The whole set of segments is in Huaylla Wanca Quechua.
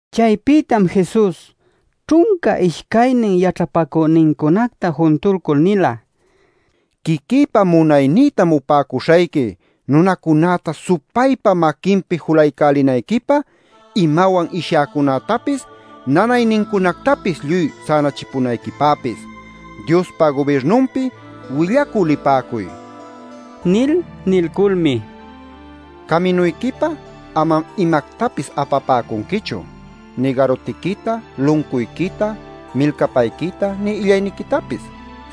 Chaypïtam Jesus ćhunca ishcaynin yaćhapacünincunacta juntuycul nila: “Quiquïpa munaynïtam upäcuśhayqui nunacunäta supaypa maquinpi julaycälinayquipä, imawan ishyäcunätapis nanaynincunactapis lluy sänachipäcunayquipäpis. Diospa gubirnunpi willacü lipäcuy” nil. Nilculmi: “Caminuyquipä amam imactapis apapäcunquichu, nï garutiquita, luncuyquita, milcapayquita, nï illayniquitapis.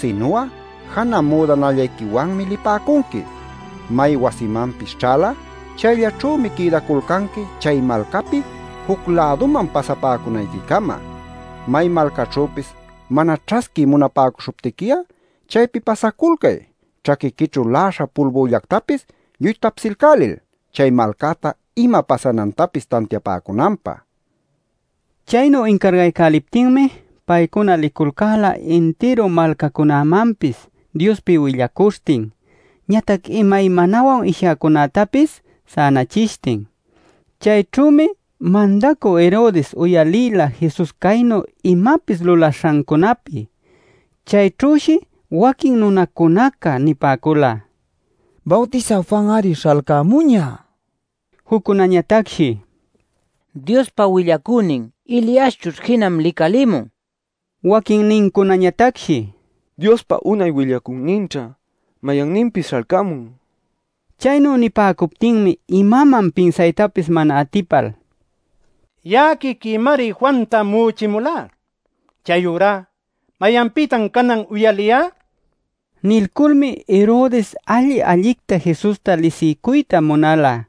Sinu'a janä müdanallayquiwanmi lipäcunqui. May wasimanpis ćhal'a chayllaćhümi quïdaculcanqui chay malcapi juc-läduman pasapäcunayquicama. May malcaćhüpis mana ćhasquiy munapäcuśhuptiqui'a chaypi pasaculcay ćhaquiquićhu la'aśha pulbüllactapis lluy tapsilcälil chay malcäta ima pasanantapis tantiapäcunanpä” nil. Chaynu incaraycäliptinmi paycuna liculcäla intiru malcacunamanpis Diospi willacuśhtin, ñatac imaymanawan ishyäcunactapis sänachishtin. Chayćhümi Mandacü Herodes uyalïla Jesus caynu imapis lulaśhancunapi. Chayćhüshi waquin nunacuná nipäcula: “Bawtisä Juan-ari śhalcämuñä”; juccunañatacshi “Diospa willacünin Eliaschućh jinam licalïmun”; waquinnincunañatacshi “Diospa unay willacüninćha mayanninpis śhalcämun” nil. Chaynu nipäcuptinmi imaman pinsaytapis mana atipal: “Ya'a quiquïmari Juanta mu'uchimulá. Chayurá ¿mayanpïtan canan uyalïyá?” nila. Nilculmi Herodes alli-allicta Jesusta lisiycuyta munala.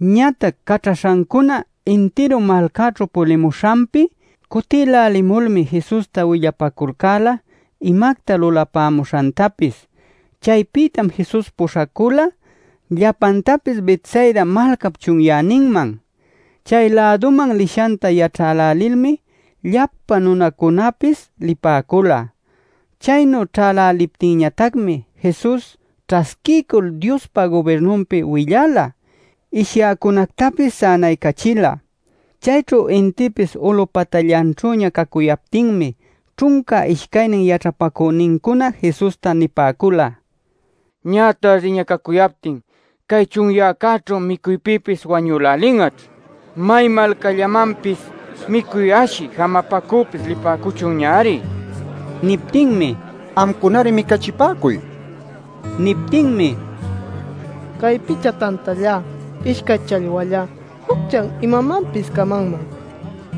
Ñatac caćhaśhancuna intiru malcaćhu pulimuśhanpi cutïlälimulmi Jesusta willapäculcäla imacta lulapämuśhantapis. Chaypïtam Jesus puśhacula llapantapis Betsaida malcap chunyäninman. Chay-läduman lishanta yaćhälälilmi llapa nunacunapis lipäcula. Chaynu ćhäläliptinñatacmi Jesus ćhasquiycul Diospa gubirnunpi willala, ishyäcunactapis sänaycachila. Chayćhu intïpis ulup patallanćhüña cacuyaptinmi ćhunca ishcaynin yaćhapacünincuna Jesusta nipäcula: “Ñä tardiña cacuyaptin cay chunyäcäćhu micuypïpis wañülälin'aćh. May malcallamanpis micuy ashï jamapacüpis lipäcuchunñari” nil. Niptinmi: “Amcunari micachipäcuy” nila. Niptinmi: “Cay picha tantallá, ishcay challwallá jucchá imanmanpis camanman.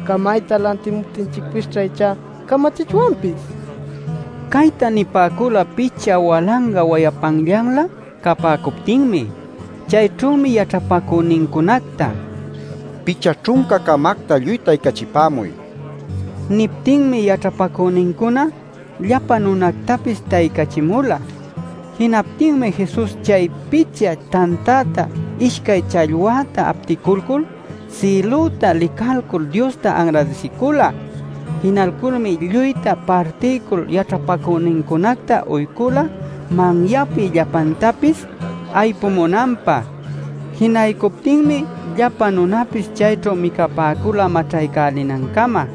Camayta lantimuptinchicpisćha ichá camachichwanpis” nipäcula. Cayta nipäcula picha walanga wayapanllanlä capäcuptinmi. Chayćhümi yaćhapacünincunacta: “Picha ćhunca-camacta lluy taycachipämuy” nila. Niptinmi yaćhapacünincuna llapa nunactapis taycachimula. Jinaptinmi Jesus chay picha tantäta, ishcay challwäta apticulcul, sïlüta licalcul Diosta anradisicula. Jinalculmi lluyta partilcul yaćhapacünincunacta uycula manyapi llapantapis aypumunanpä. Jinaycuptinmi llapa nunapis chayćhu micapäcula maćhaycälinancama.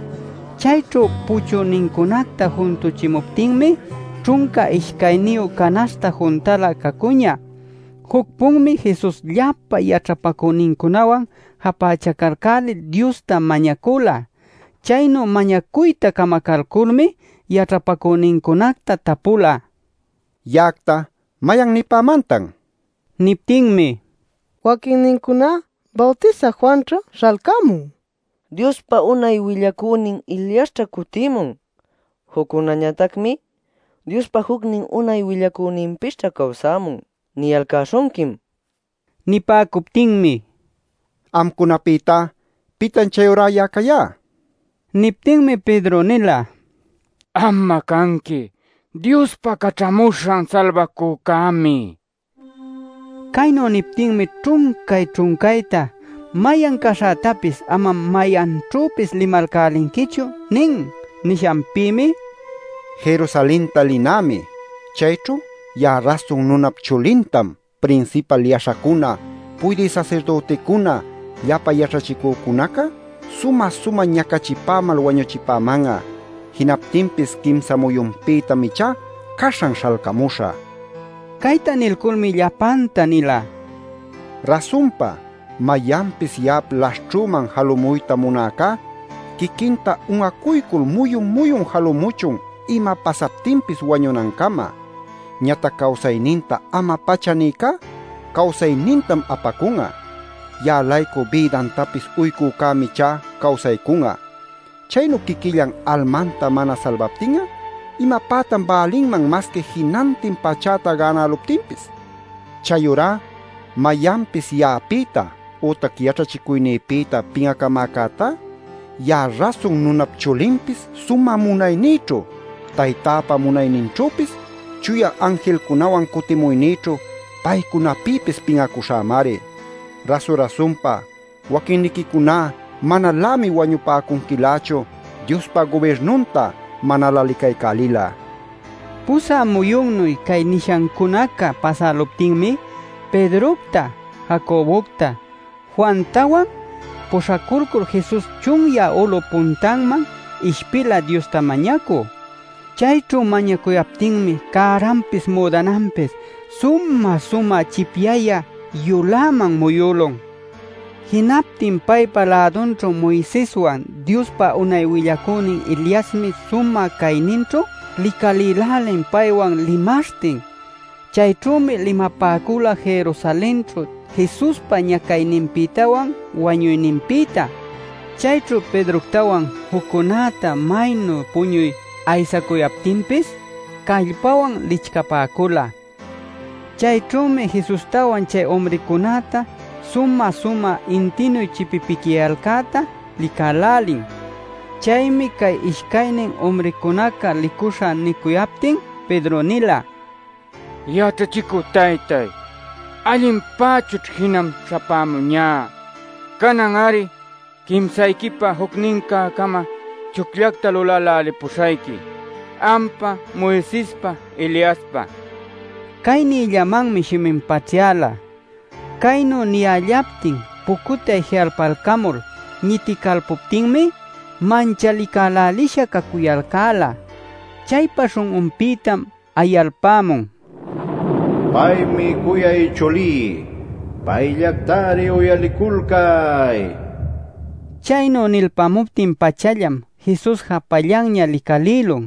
Chayćhu puchünincunacta juntuchimuptinmi ćhunca ishcayniyu canaśhta juntalä cacuñä. Juc-punmi Jesus llapa yaćhapacünincunawan japächacalcälil Diosta mañacula. Chaynu mañacuyta camacalculmi yaćhapacünincunacta tapula: “Ya'acta ¿mayan nipämantan?” nil. Niptinmi: “Waquinnincuná: ‘Bawtisä Juanćha śhalcämun’; waquinnincunañatacmi: ‘Diospa unay willacünin Eliasćha cutïmun’; juccunañatacmi: ‘Diospa jucnin unay willacüninpisćha cawsämun’ niyalcäśhunquim” nipäcula. Nipäcuptinmi: “Amcunapïtá ¿pitan chayurá ya'a cayá?” nila. Niptinmi Pedro nila: “Am'a canqui Diospa Caćhamuśhan Salbacücämi” nil. Caynu niptinmi ćhuncay-ćhuncayta: “Mayan caśhätapis amam mayanćhüpis limalcälinquichu” nin. Nishanpïmi: “Jerusalenta linämi. Chayćhu ya'a Rasun Nunap Chulintam prinsipal yaśhacuna, puydï sasirdüticuna, llapa yaćhachicünincuna sumä-sumä ñacachipämal wañuchipäman'a. Jinaptinpis quimsa muyunpïtam ichá caśhan śhalcamuśhä” nila. Cayta nilculmi llapanta nila: “Rasunpa mayanpis ya'ap laśhćhüman jalumuyta munäcá quiquinta un'acuycul muyun-muyun jalumuchun ima pasaptinpis wañunancama. Ñatac cawsayninta ama-pacha nïcá cawsaynintam apacun'a. Ya'a-laycu bïdantapis uycücämi ichá cawsaycun'a. Chaynu quiquillan almanta mana salbaptin'a ¿imapätan bälinman masqui jinantin pachäta gänäluptinpis? Chayurá mayanpis ya'apïta ütac yaćhachicuynïpïta pin'acamäcätá ya'a Rasun Nunap Chulinpis sumä munaynïćhu, Taytäpa munayninćhüpis, chuya anjilcunawan cutimuynïćhu paycunapïpis pin'acuśhämari. Rasu-rasunpa waquinniquicuná manalämi wañupäcunquilächu Diospa gubirnunta manalä licaycälil'a” nin. Pusä muyunnuy cay nishancunaca pasäluptinmi Pedrocta, Jacobocta, Juantawan puśhaculcul Jesus chunyä ulup puntanman ishpila Diosta mañacü. Chayćhu mañacuyaptinmi cäranpis müdananpis sumä-sumä chipyayä yuläman muyülun. Jinaptin paypa lädunćhu Moiseswan Diospa unay willacünin Eliasmi sumä cayninćhu licalïlälin paywan limaśhtin. Chayćhümi limapäcula Jerusalenćhu Jesuspa ñacayninpïtawan wañuyninpïta. Chayćhu Pedroctawan juccunäta maynu puñuy aysacuyaptinpis callpawan licchapäcula. Chayćhümi Jesustawan chay umrïcunäta sumä-sumä intïnu chipipicyayalcäta licälälin. Chaymi cay ishcaynin umrïcunaca licuśha nicuyaptin Pedro nila: “Yaćhachicü taytáy, allinpächućh jinam śhapämuñá. Canan-ari quimsayquipä jucnincä-cama chucllacta lulälälipuśhayqui, ampä, Moisespä, Eliaspä” nil. Cay niyllamanmi shimin paćhyala. Caynu niyällaptin pucutay ji'alpalcamul ñiticalpuptinmi manchalicälälisha cacuyalcäla. Chaypa śhun'unpïtam ayalpämun: “Paymi cuyay chulí. Payllactari uyaliculcay” nil. Chaynu nilpämuptin-pachallam Jesus japallanña licalïlun.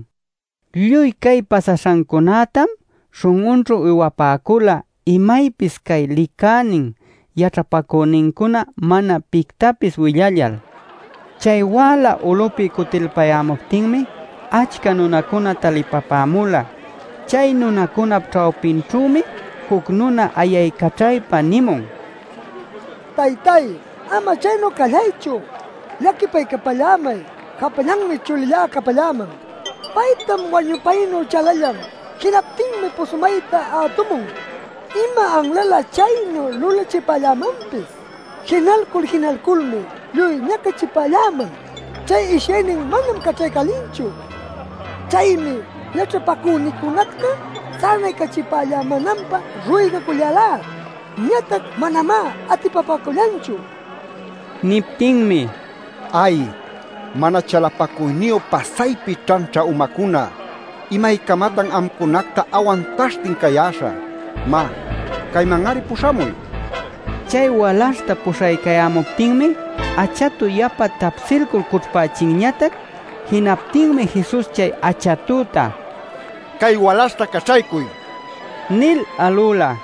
Lluy cay pasaśhancunätam śhun'unćhu uywapäcula imaypis cay licänin yaćhapacünincuna mana pictapis willallal. Chay wäla ulüpi cutilpayämuptinmi achca nunacuna talipapämula. Chay nunacunap ćhawpinćhümi juc nuna ayaycaćhaypa nïmun: “Taytáy, ama chaynu callaychu. Llaquipaycapallämay. Japallanmi chulillá capalläman. Paytam wañupaynu chalallan. Jinaptinmi pushumayta ätumun. Ima anlalä chaynu lulachipallämanpis. Jinalcul jinalculmi lluy ñacachipalläman; chay ishyaynin manam caćhaycälinchu. Chaymi yaćhapacüniquicunacta sänaycachipallämänanpä ruygacullälá. Ñatac manamá atipapäcullanchu” nin. Niptinmi: “¡Ay, mana chalapacuyniyu pasaypi ćhanćha umacuna! ¿Imaycamatan amcunacta awantaśhtin cayäśhä? Má, cayman-ari puśhamuy” nila. Chay walaśhta puśhaycayämuptinmi achatu yapa tapsilcul cućhpächinñatac. Jinaptinmi Jesus chay achatüta: “¡Cay walaśhta caćhaycuy!” nil alüla.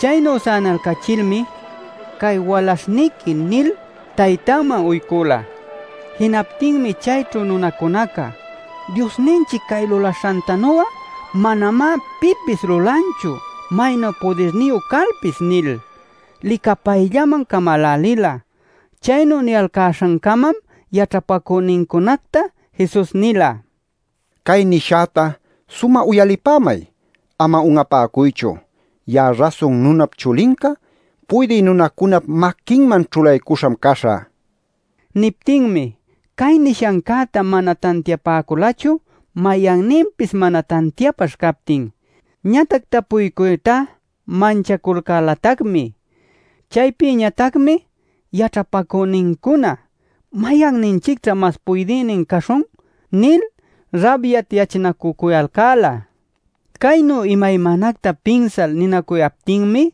Chaynu sänalcachilmi: “Cay walaśhniqui” nil taytanman uycula. Jinaptinmi chayćhu nunacunaca: “Diosninchic cay lulaśhantanu'a manamá pipis lulanchu maynu pudirniyu calpis” nil licapayllaman camälälila. Chaynu niyalcäśhancamam yaćhapacünincunacta Jesus nila: “Cay nishäta sumä uyalipämay, ama un'apäcuychu. Ya'a Rasun Nunap Chulinca puydï nunacunap maquinman ćhulaycuśham caśhä” nil. Niptinmi cay nishancäta mana tantiapäculachu mayanninpis mana tantiapaśh captin. Ñatac tapuycuytá manchaculcälatacmi. Chaypïñatacmi yaćhapacünincuna: “¿Mayanninchicćha mas puydïnin caśhun?” nil rabyatyachinacücuyalcäla. Caynu imaymanacta pinsal ninacuyaptinmi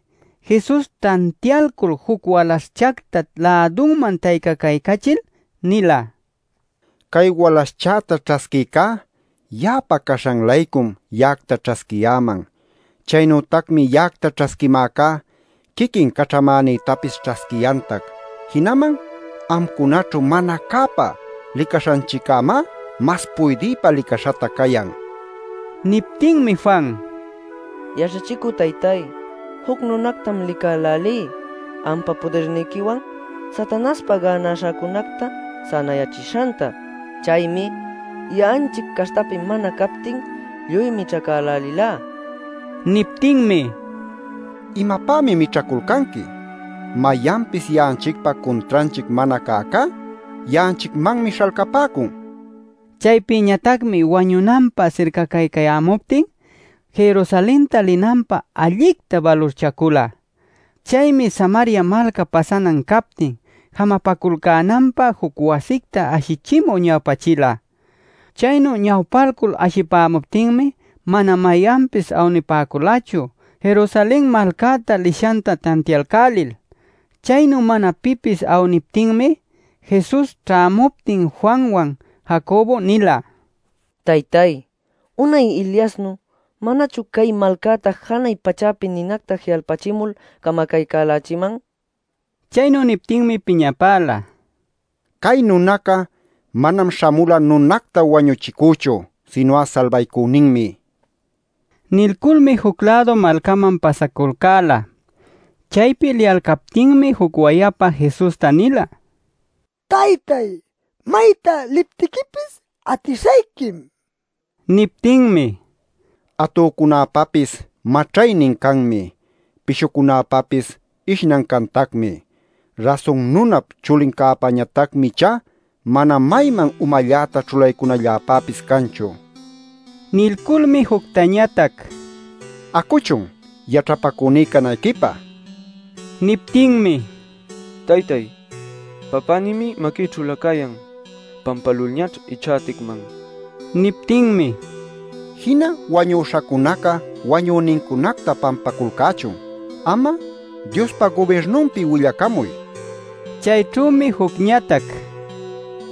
Jesus tantialcul juc walaśhchacta lädunman taycacaycachil nila: “Cay walaśhchäta ćhasquïcá ya'apa caśhan-laycum ya'acta ćhasquiyäman. Chaynütacmi ya'acta ćhasquimäcá quiquin caćhamänïtapis ćhasquiyantac. Jinaman amcunaćhu mana cäpä licaśhanchiccämá mas puydïpä licaśhatac cayan” nil. Niptinmi Juan: “Yaćhachicü taytáy, juc nunactam licälälí ampa pudirniquiwan Satanaśhpa gänaśhacunacta sänayächishanta. Chaymi ya'anchic caśhtapi mana captin lluy mićhacälälilá” nila. Niptinmi: “¿Imapämi mićhaculcanqui? Mayanpis ya'anchicpa cuntranchic mana cäcá ya'anchicmanmi śhalcapäcun” nin. Chaypïñatacmi wañunanpä sircacaycayämuptin, Jerusalenta linanpä allicta balurchacula. Chaymi Samaria malcap pasanan captin jamapaculcänanpä juc wasicta ashichimü ñawpachila. Chaynu ñawpalcul ashipämuptinmi mana mayanpis awnipäculachu Jerusalen malcäta lishanta tantialcälil. Chaynu mana pipis awniptinmi, Jesus ćhämuptin Juanwan, Jacobo nila: “Taytáy, unay Eliasnu ¿manachun cay malcäta janay pachäpi ninacta ji'alpächimul camacaycälächïman?” nil. Chaynu niptinmi piñapäla: ˻“Cay nunaca manam śhamula nunacta wañuchicüchu, sinu'a salbaycüninmi”.˼ Nilculmi juc-lädu malcaman pasaculcäla. Chaypi liyalcaptinmi juc wayapa Jesusta nila: “Taytáy, mayta liptiquipis atishayquim” nil. Niptinmi: “Atücunäpäpis maćhaynin canmi. Pishucunäpapis ishnan cantacmi. Rasun Nunap Chulincäpañatacmi ichá mana mayman umalläta ćhulaycunalläpäpis canchu” nin. Nilculmi juctañatac: “Acuchun, yaćhapacüní canayquipä” nila. Niptinmi: “Taytáy, papänïmi maquïćhülä cayan. Pampälulñaćh ichá aticman” nila. Niptinmi: “Jina wañuśhacunaca wañünincunacta pampaculcächun. Am'a Diospa gubirnunpi willacamuy” nin. Chayćhümi jucñatac: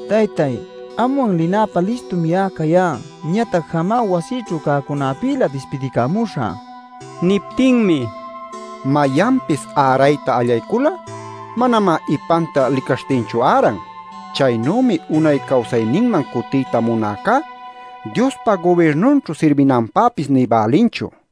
“Taytáy, anwan linäpä listum ya'a cayá. Ñatac jamá, wasïćhu cäcunäpïlä dispidicamuśhä.” Nila. Niptinmi: “Mayanpis ärayta allaycul'a, manamá ipanta licaśhtinchu äran. Chaynümi unay cawsayninman cutiyta munäcá Diospa gubirnunćhu sirbinanpäpis nï bälinchu” nila.